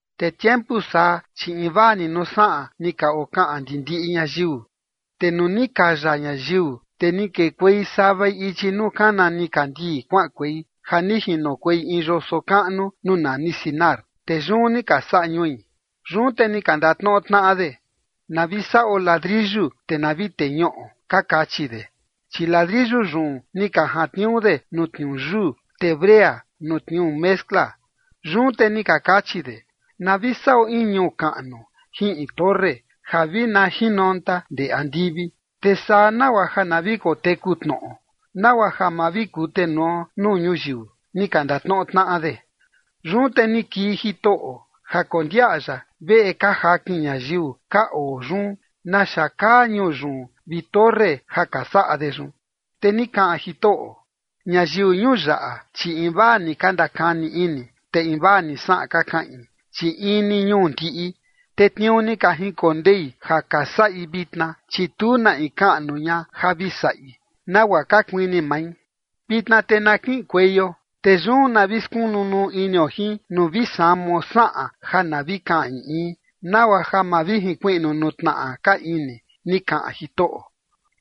Te tiempu saa, chi invaa ni nuu saꞌan ni ka okaꞌan ndi ndiꞌi ñayiu. Te nuu ni kaya ñayiu, te ni kekuei savai ichi nuu kana nikandii kuaꞌankuei ja ni jinokuei in yoso kaꞌnu nuu nani Sinar, te yun ni ka saꞌa ñui. Yun te ni ka ndatnoꞌo tnaꞌa de: ―Na vi saꞌo ladriyu te na vi teñuꞌo ―ka kachi de. Chi ladriyu yun ni ka jantniuu de nuu tniuu yuu, te brea nuu tniuu mezcla. Yun te ni ka kachi de: ―Na vi saꞌo in ñuu kaꞌnu jin in torre ja vi na jinonta ndee andivi, te saa nagua ja na vi koteku tnoꞌo, nagua ja ma vi kutenuo nuu ñuyiu ―ni ka ndatnoꞌo tnaꞌa de. Yun te ni kii Jitoꞌo ja kondiaꞌa ya veꞌe ka jakin ñayiu ka oo yun naxa kaa ñuu yun vi torre ja ka saꞌa de yun. Te ni kaꞌan Jitoꞌo: ―Ñayiu ñuu yaꞌa, chi invaa ni ka ndakani ini, te invaa ni saꞌan ka kaꞌin, chi in ni ñuu ndiꞌi, te tniuu ni ka jinkondei ja ka saꞌi vitna, chi tu na in kaꞌnu ña ja vi saꞌi nagua ka kuini mai. Vitna te na kiꞌinkueio, te yun na vi skunu nuu inio jin nuu vi samao saꞌan ja na vi kaꞌan in in, nagua ja ma vi jinkuiꞌnu nuu tnaꞌa ka ini ―ni kaꞌan Jitoꞌo.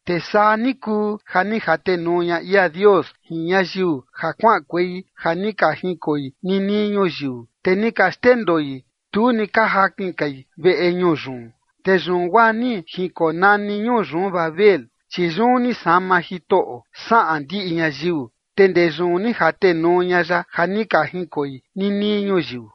Te saa ni kuu ja ni jatenuu ña ia Dios jin ñayiu ja kuaꞌankuei ja ni ka jinkoi ninii ñuyiu, te ni ka xndendoi, tu ni ka jakin kai veꞌe ñuu yun. Te yun guaa ni jinkonani ñuu yun Babel, chi yun ni sama Jitoꞌo saꞌan ndiꞌi ñayiu, te ndee yun ni jatenuu ña ya ja ni ka jinkoi ninii ñuyiu.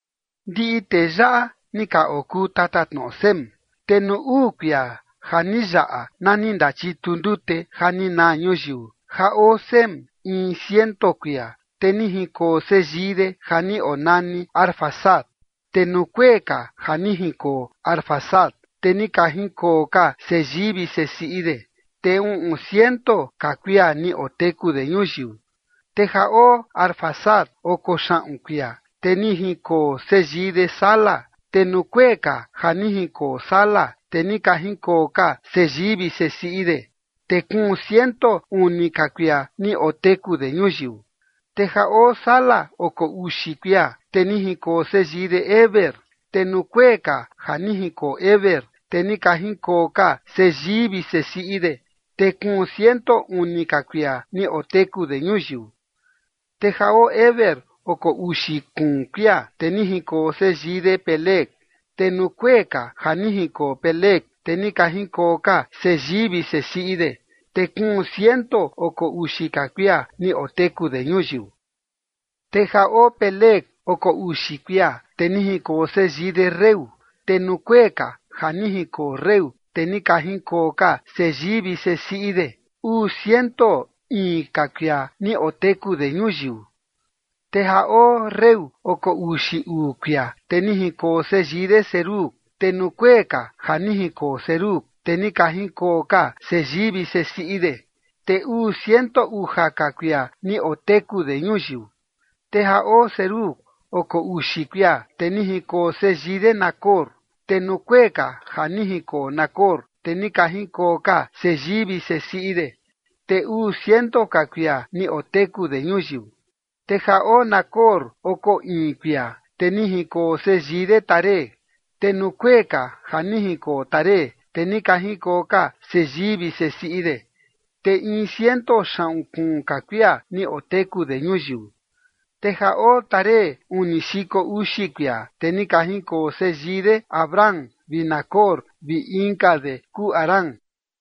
Ndiꞌi tee yaꞌa ni ka okuu tatatnoꞌo Sem. Te nuu uu kuia ja ni yaꞌa nani ndachitu ndute ja ni naa ñuyiu ja oo Sem in ciento kuia, te ni jinkoo seyii de ja ni onani Arfaxad. Te nuu kuee ka ja ni jinkoo Arfaxad, te ni ka jinkoo ka seyii vi sesiꞌi de, te uꞌun ciento ka kuia ni oteku de ñuyiu. Te ja oo Arfaxad oko xaꞌun kuia, te ni jinkoo seyii de Sala. Te nuu kuee ka ja ni jinkoo Sala, te ni ka jinkoo ka seyii vi sesiꞌi de, te kuun ciento uni ka kuia ni oteku de ñuyiu. Te ja oo Sala oko uxi kuia, te ni jinkoo seyii de Heber. Te nuu kuee ka ja ni jinkoo Heber, te ni ka jinkoo ka seyii vi sesiꞌi de, te kuun ciento uni ka kuia ni oteku de ñuyiu. Te ja oo Heber oko uxi kuun kuia, te ni jinkoo seyii de Peleg. Te nuu kuee ka ja ni jinkoo Peleg, te ni ka jinkoo ka seyii vi sesiꞌi de, te kuun ciento oko uxi ka kuia ni oteku de ñuyiu. Te ja oo Peleg oko uxi kuia, te ni jinkoo seyii de Reu. Te nuu kuee ka ja ni jinkoo Reu, te ni ka jinkoo ka seyii vi sesiꞌi de uu ciento iin ka kuia ni oteku de ñuyiu. Te ja oo Reu oko uxi uu kuia, te ni jinkoo seyii de Serug. Te nuu kuee ka ja ni jinkoo Serug, te ni ka jinkoo ka seyii vi sesiꞌi de, te uu ciento uja ka kuia ni oteku de ñuyiu. Te ja oo Serug oko uxi kuia, te ni jinkoo seyii de Nacor. Te nuu kuee ka ja ni jinkoo Nacor, te ni ka jinkoo ka seyii vi sesiꞌi de, te uu ciento ka kuia ni oteku de ñuyiu. Te ja oo Nacor oko iin kuia te ni jinkoo seyii de Taré. Te nuu kuee ka ja ni jinkoo Taré, te ni ka jinkoo ka seyii vi sesiꞌi de, te in ciento xaꞌun kuun ka kuia ni oteku de ñuyiu. Te ja oo Taré uni xiko uxi kuia, te ni ka jinkoo seyii de Abram vi Nacor vi inka de kuu Harán.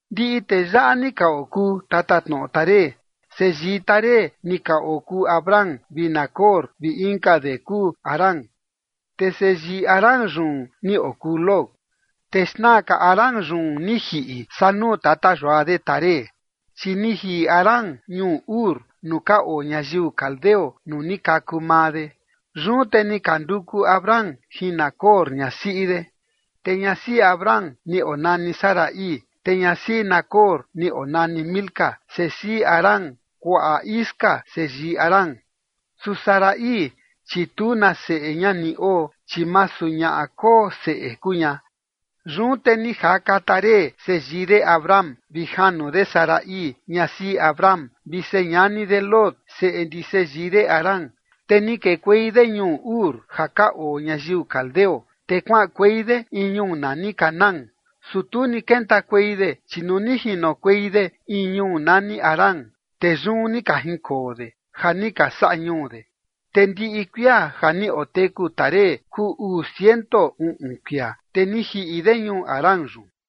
Ndiꞌi tee yaꞌa ni ka okuu tatatnoꞌo Taré. Seyii Taré ni ka okuu Abram vi Nacor vi inka de kuu Harán. Te seyii Harán yun ni okuu Lot. Te xna ka Harán yun ni jiꞌi saa nuu tata yua de Taré, chi ni jiꞌi Harán ñuu Ur nuu ka oo ñayiu caldeo nuu ni kaku maa de. Yun te ni ka nduku Abram jin Nacor ñasiꞌi de. Te ñasiꞌi Abram ni onani Sarai, te ñasiꞌi Nacor ni onani Milca, sesiꞌi Harán kuaꞌa Isca seyii Harán. Su Sarai, chi tu na seꞌe ña ni oo, chi masu ñaꞌa koo seꞌe kuu ña. Yun te ni jaka Taré seyii de Abram vi janu de Sarai ñasiꞌi Abram vi señani de Lot seꞌe ndi seyii de Harán, te ni kekuei de ñuu Ur ja ka oo ñayiu caldeo, te kuaꞌankuei de in ñuu nani Canaán. Su tu ni kentakuei de, chi nuu ni jinokuei de in ñuu nani Harán, te yun ni ka jinkoo de ja ni ka saꞌa ñuu de. Te ndiꞌi kuia ja ni oteku Taré kuu uu ciento uꞌun kuia, te ni jiꞌi de ñuu Harán yun.